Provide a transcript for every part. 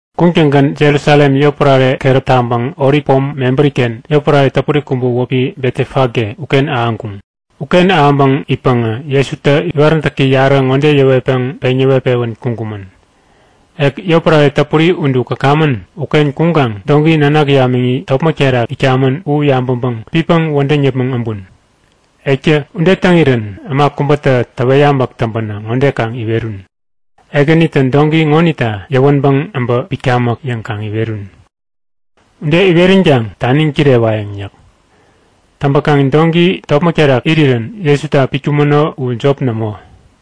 Kuŋtäŋgän Jerusalem yotpärare keräp taŋpäŋ Olip pom mebäri-ken yotpärare täpuri kubä wäpi Betefage uken ahäŋkuŋ. Uken ahäŋpäŋ itpäŋä Jesutä iwaräntäki yarä ŋode yäwetpäŋ peŋ yäwet-pewän kuŋkumän; Ek yotpärare täpuri udu käkamän uken kuŋkaŋ doŋki nanak yamiŋi topmäk terak itkamän u yabäŋpäŋ pitpäŋ wädäŋ yäpmäŋ äbun. Ektä ude täŋirän äma kubätä täwet yabäk täŋpänä ŋode kaŋ iwerun; Ekänitä doŋki ŋonita yäwänpäŋ äbä pitkamäk yäŋ kaŋ iwerun. Ude iweränkaŋ taniŋ kirewayäŋ yäk. Täŋpäkaŋ doŋki topmäk terak irirän Jesuta pitkumäno u jop nämo.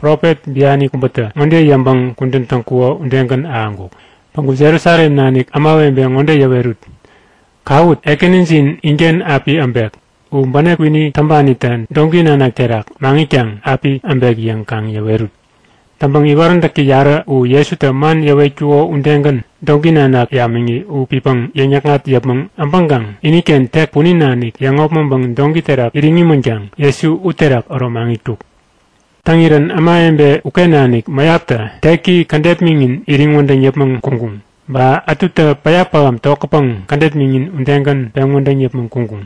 Profet biani kubätä ŋode yäŋpäŋ kudän täŋkuko udegän ahäŋkuk; Päŋku Jerusalem nanik ämawebe ŋode yäwerut; Kawut! Ekänijin inken api äbek. U bänep kwini täŋpanitä doŋki nanak terak maŋitkaŋ api äbek yäŋ kaŋ yäwerut. Täŋpäŋ iwaräntäki yarä u Jesutä man yäwetkuko udegän doŋki nanak yamiŋi u pitpäŋ yäŋ-yäkŋat yäpmäŋ äbäŋkaŋ iniken tek punin nanik yäŋopmäŋpäŋ doŋki terak iriŋ imänkaŋ Jesu uterak äro maŋitkuk. Täŋirän ämawebe uken nanik mäyaptä teki kädet miŋin iriŋ wädäŋ yäpmäŋ kuŋkuŋ. Ba ätutä päya pähäm tokätpäŋ kädet miŋin udegän peŋ wädäŋ yäpmäŋ kuŋkuŋ.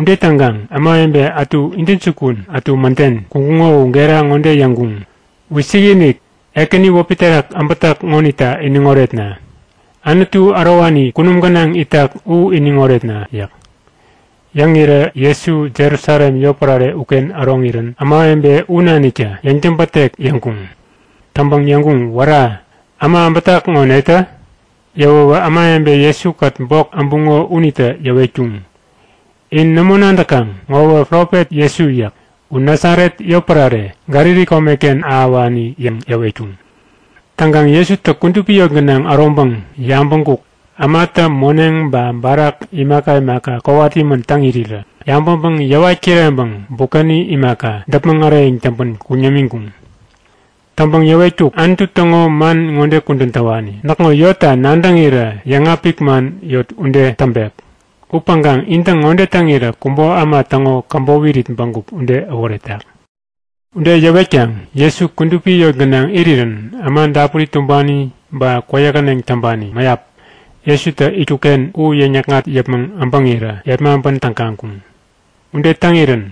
Ude täŋkaŋ ämawebe ätu intäjukun, ätu mäden kuŋkuŋo u gera ŋode yäŋkuŋ; Wisikinik! Ekäni wäpi terak äbätak ŋonita iniŋ oretna! Anutu ärowani kunum gänaŋ itak u iniŋ oretna! yäk. Yäŋirä Jesu Jerusalem yotpärare uken äroŋirän ämawebe u naniktä yäŋtäbätek yäŋkuŋ. Täŋpäŋ yäŋkuŋ; Wära! Äma äbätak ŋo netä? Yäwäwä ämawebe Jesu-kät bok äbuŋo unitä yäwetkuŋ; In nämo nadäkaŋ? Ŋowä profet Jesu yäk. U Nasaret yotpärare, Galili komeken ahäwani yäŋ yäwetkuŋ. Täŋkaŋ Jesutä kudupi yot gänaŋ äroŋpäŋ yabäŋkuk; Ämatä moneŋ ba barak imaka imaka kowat imän täŋ irirä. Yabäŋpäŋ yäwat kireŋpäŋ bukäni imaka, däpmäŋ äreyäŋ täŋpän kuŋ yämiŋkuŋ. Täŋpäŋ yäwetkuk; Anutu täŋo man ŋode kudän täwani; Näkŋo Yotta nadäŋirä yäŋapik man yot ude täŋpek. Upäŋkaŋ intä ŋode täŋirä kubo äma täŋo käbop irit bägup ude äworetak! Ude yäwetkaŋ Jesu kudupi yot gänaŋ irirän äma dapuri tumbani ba kwäyähäneŋ täŋpani mäyap Jesutä itkuk-ken u yäŋ-yäkŋat yäpmäŋ äbäŋirä yepmaŋpän tägaŋkuŋ. Ude täŋirän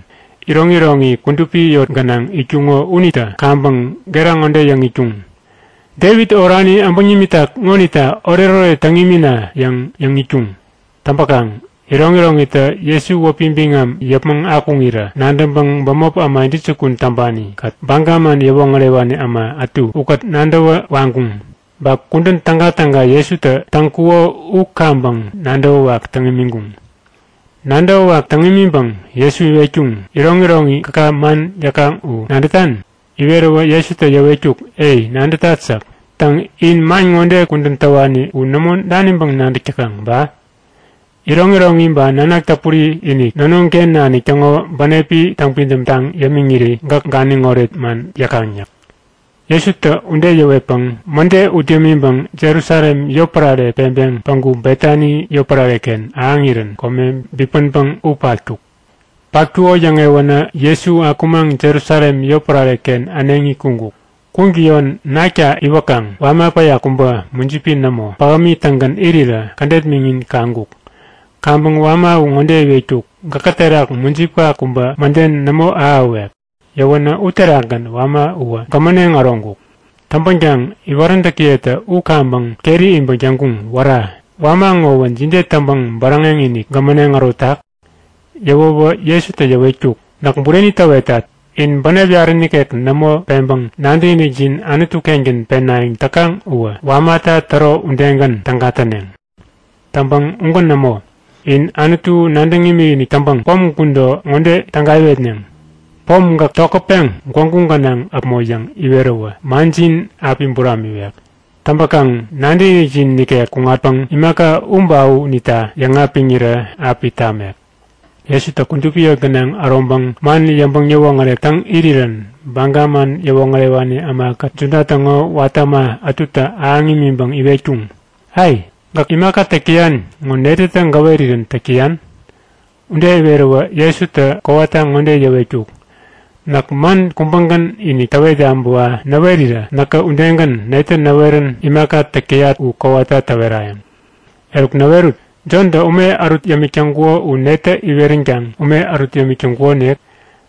iroŋiroŋi kudupi yot gänaŋ itkuŋo unitä kaŋpäŋ gera ŋode yäŋ itkuŋ; Devit orani äbäŋ nimitak ŋonita oretoret täŋ imina! yäŋ yäŋ itkuŋ. Täŋpäkaŋ iroŋiroŋitä Jesu wäpi biŋam yäpmäŋ akuŋirä nadäŋpäŋ bämop äma intäjukun täŋpani-kät Baga man yäwoŋärewani äma ätu ukät nadäwä waŋkuŋ. Ba kudän tägatäga Jesutä täŋkuko u kaŋpäŋ nadäwäwak täŋ imiŋkuŋ. Nadäwäwak täŋ imiŋpäŋ Jesu iwetkuŋ; Iroŋiroŋi gäka man yäkaŋ u nadätan? Iweräwä Jesutä yäwetkuk; Ei, nadätat yäk. Täŋ, in man ŋode kudän täwani u nämo daniŋpäŋ nadäk täkaŋ ba? Iroŋiroŋi ba nanak täpuri-inik nonoŋ-ken nanik täŋo bänepi täŋpidäm taŋ yämiŋiri gäk ganiŋoret man yäkaŋ yäk. Jesutä ude yäwetpäŋ mäde ut yämiŋpäŋ Jerusalem yotpärare peŋpeŋ päŋku Betani yotpärare-ken ahäŋirän kome bipänpäŋ u patkuk. Patkuko yäŋewänä Jesu akumaŋ Jerusalem yotpärare-ken äneŋi kuŋkuk. Kuŋtäyon nakta iwäkaŋ wama päya kubä, mujipi nämo, pähämi-tägän irirä kädet miŋin kaŋkuk. Kaŋpäŋ wama u ŋode iwetkuk; Gäkä terak mujipka kubä mäden nämo ahäwek! Yäwänä uterakgän wama uwä gämäneŋ äroŋkuk. Täŋpänkaŋ iwaräntäkiyetä u kaŋpäŋ keri iŋpäŋ yäŋkuŋ; Wära! Wama ŋowä jide täŋpäŋ bäräŋek-inik gämäneŋ ärotak? Yäwäwä Jesutä yäwetkuk; Näk bureni täwetat. In bänep yarä nikek nämo peŋpäŋ nadäkinikjin Anutu-kengän penayäŋ täkaŋ uwä wamata täro udegän täga täneŋ. Täŋpäŋ ugän nämo. In Anutu nadäŋ imikinik täŋpäŋ pom gudo ŋode täga iwetneŋ; Pom, gäk tokätpeŋ gwägu gänaŋ äpmo yäŋ iweräwä manjin api buramiwek. Täŋpäkaŋ nadäkinikjin nikek kuŋatpäŋ imaka u ba u unita yäŋapiŋirä api tamek. Jesutä kudupi yot gänaŋ äroŋpäŋ man yäŋpäŋ yäwoŋärek täŋ irirän Baga man yäwoŋärewani ämakät Juda täŋo watä äma ätutä ahäŋ imiŋpäŋ iwetkuŋ; Ai! Gäk imaka täk täyan ŋo netätä gäwerirän täk täyan? Ude iweräwä Jesutä kowata ŋode yäwetkuk; Näk man kubägän-inik täwet yabäwa näwerirä näkä udegän netä näwerän imaka täk täyat u kowata täwerayäŋ. Eruk näwerut! Jontä ume ärut yämik täŋkuko u netä iweränkaŋ ume ärut yämik täŋkukonik?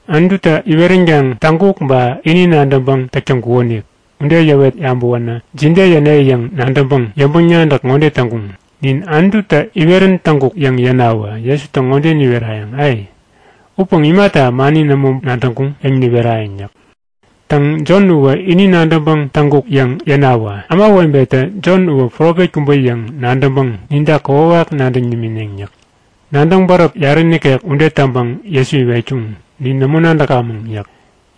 Anututä iweränkaŋ täŋkuk ba ini nadäŋpäŋ täk täŋkukonik? Ude yäwet yabäwänä jide yäne yäŋ nadäŋpäŋ yäŋpäŋ-nadäk ŋode täŋkuŋ; Nin Anututä iwerän täŋkuk yäŋ yänawä Jesutä ŋode niwerayäŋ; A! Upäŋ imata mani nämo nadäŋkuŋ? yäŋ niwerayäŋ yäk. Täŋ, Jon uwä ini nadäŋpäŋ täŋkuk yäŋ yänawä ämawebetä Jon uwä profet kubä yäŋ nadäŋpäŋ ninta kokwawak nadäŋ nimineŋ yäk. Nadäŋ-bäräp yarä nikek ude täŋpäŋ Jesu iwetkuŋ; Nin nämo nadäkamäŋ yäk.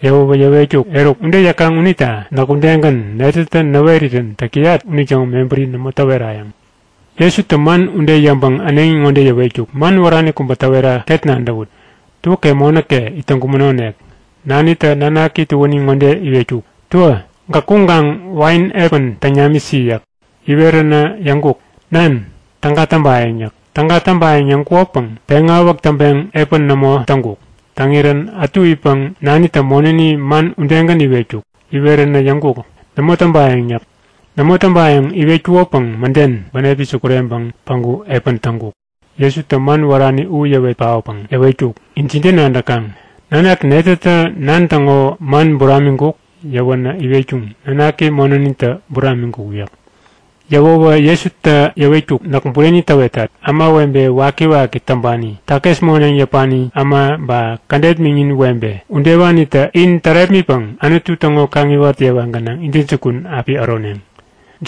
Yäwäwä yäwetkuk; Eruk, ude yäkaŋ unita näk udegän netätä näwerirän täk täyat unitäŋo mebäri nämo täwerayäŋ. Jesutä man ude yäŋpäŋ äneŋi ŋode yäwetkuk; Man wärani kubä täwera ket nadäwut; Tuäke monäke it täŋkumänonik. Nanitä nanaki tuäni ŋode iwetkuk; Tuä, gäk kuŋkaŋ wain epän täŋ namisi yäk. Iweränä yäŋkuk; Nan, täga täŋpayäŋ yäk. Täga täŋpayäŋ yäŋkukopäŋ peŋawäk täŋpeŋ epän nämo täŋkuk. Täŋirän ätu itpäŋ nanitä monäni man udegän iwetkuk. Iweränä yäŋkuk; Nämo täŋpayäŋ! yäk. Nämo täŋpayäŋ iwetkukopäŋ mäden bänepi sukureŋpäŋ päŋku epän täŋkuk. Jesutä man wärani u yäwet paotpäŋ yäwetkuk; In jide nadäkaŋ? Nanak netätä nan täŋo man buramiŋkuk? Yäwänä iwetkuŋ; Nanaki monänitä buramiŋkuk yäk. Yäwäwä Jesutä yäwetkuk; Näk bureni täwetat. Ämawebe wakiwaki täŋpani, takis moneŋ yäpani äma ba kädet miŋin webe udewanitä in tärepmitpäŋ Anutu täŋo kaŋiwat yewa gänaŋ intäjukun api äroneŋ.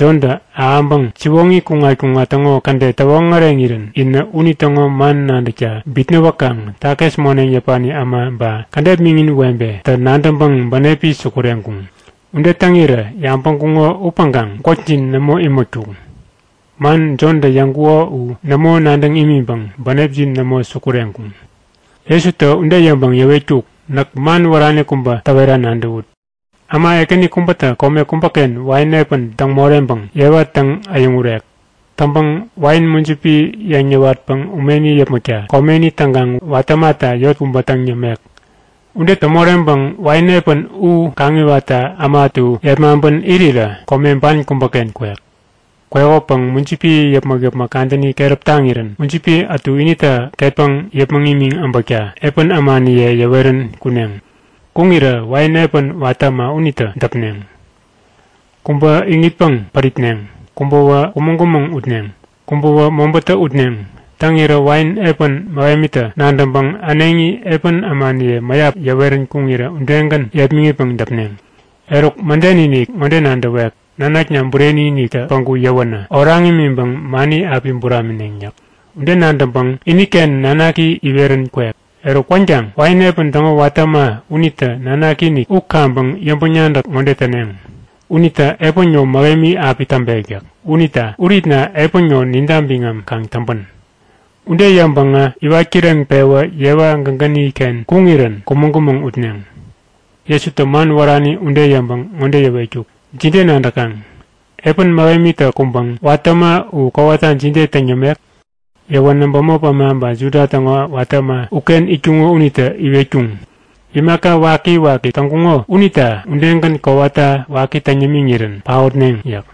Jontä ahäŋpäŋ siwoŋi kuŋat-kuŋat täŋo kädet täwoŋäreŋirän inä unitäŋo man nadäkta bitnäwäkaŋ takis moneŋ yäpani äma ba kädet miŋin webetä nadäŋpäŋ bänepi sukureŋkuŋ. Ude täŋirä yabäŋkuŋo upäŋkaŋ gwäkjin nämo imätkuŋ. Man Jontä yäŋkuko u nämo nadäŋ imiŋpäŋ bänepjin nämo sukureŋkuŋ. Jesutä ude yäŋpäŋ yäwetkuk; Näk man wärani kubä täwera nadäwut; Äma ekäni kubätä kome kubäken wain epän täŋ moreŋpäŋ yewa täŋ-äyäŋurek. Täŋpäŋ wain mujipi yeŋ yäwatpäŋ umeni yäpmäkta komeni täŋkaŋ watä ämata yot kubä täŋ yämek. Ude täŋ moreŋpäŋ wain epän u kaŋiwatta äma ätu yepmaŋpän irirä kome ban kubäken kwek. Kwekopäŋ mujipi yäpmäk-yäpmäk kadäni keräp taŋirän mujipi ätu inita ketpäŋ yäpmäŋ imiŋ äbäkta epän ämaniye yäwerän kuneŋ. Kuŋirä wain epän watä äma unitä äma u yepmäŋitpäŋ däpneŋ; Kubä iŋitpäŋ päripneŋ, kubäwä kumäŋ-kumäŋ utneŋ, kubäwä mobätä utneŋ. Täŋirä wain epän mähemitä nadäŋpäŋ äneŋi epän ämaniye mäyap yäwerän kuŋirä udegän yepmäŋitpäŋ däpneŋ. Eruk mäden-inik ŋode nadäwek; Nanakna bureni-iniktä päŋku yäwänä oraŋ imiŋpäŋ mani api buramineŋ yäk. Ude nadäŋpäŋ iniken nanaki iwerän kwek. Eruk kwänkaŋ wain epän täŋo watä äma unitä nanaki-inik u kaŋpäŋ yäŋpäŋ-nadäk ŋode täneŋ; Unitä epän ŋo mähemi api täŋpek yäk. Unita uritna epän ŋo ninta biŋam kaŋ täŋpän! Ude yäŋpäŋä iwat kireŋpewä yewa gägäni-ken kuŋirän kumäŋ-kumäŋ utneŋ. Jesutä man wärani ude yäŋpäŋ ŋode yäwetkuk; Jide nadäkaŋ? Epän mähemitä kuŋpäŋ watä äma u kowata jide täŋ yämek? Yäwänä bämop äma ba Juda täŋo watä äma uken itkuŋo unitä iwetkuŋ; Imaka waki-waki täŋkuŋo unita udegän kowata waki täŋ yämiŋirän paotneŋ yäk.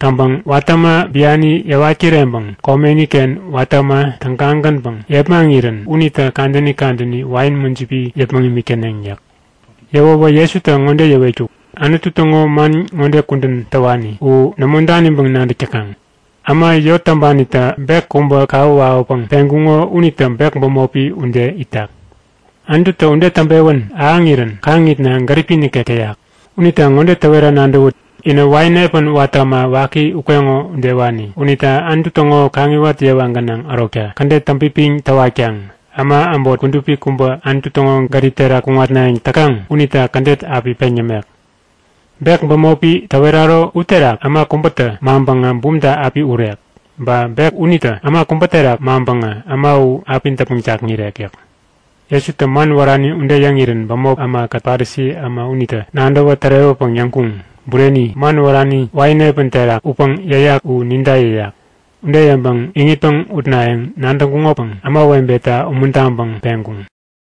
Täŋpäŋ watä äma biani yäwat kireŋpäŋ komeni-ken watä äma tägagänpäŋ yepmaŋirän unitä kadäni kadäni wain mujipi yäpmäŋ imik täneŋ yäk. Yäwäwä Jesutä ŋode yäwetkuk; Anutu täŋo man ŋode kudän täwani u nämo daniŋpäŋ nadäk täkaŋ? Äma yot täŋpanitä bek kubä kawä wawäpäŋ peŋkuŋo unitä bek bämopi ude itak. Anututä ude täŋpewän ahäŋirän kaŋitna gäripi nikek täyak. Unita ŋode täwera nadäwut; Inä wain epän watä äma waki ukeŋo udewani. Unita Anutu täŋo kaŋiwat yewa gänaŋ ärokta kädet täŋpipiŋ täwatkaŋ äma äbot kudupi kubä Anutu täŋo gärip terak kuŋatnayäŋ täkaŋ unita kädet api peŋ yämek. Bek bämopi täweraro uterak äma kubätä maŋpäŋä bumta api urek. Ba bek unitä äma kubä terak maŋpäŋä äma u api däpmäŋ jakŋirek yäk. Jesutä man wärani ude yäŋirän bämop ämakät Parisi äma unitä nadäwä tärewäpäŋ yäŋkuŋ; Bureni! Man wärani wain epän terak utpäŋ yäyak u ninta yäyak! Ude yäŋpäŋ iŋitpäŋ utnayäŋ nadäŋkuŋopäŋ ämawebeta umuntaŋpäŋ peŋkuŋ.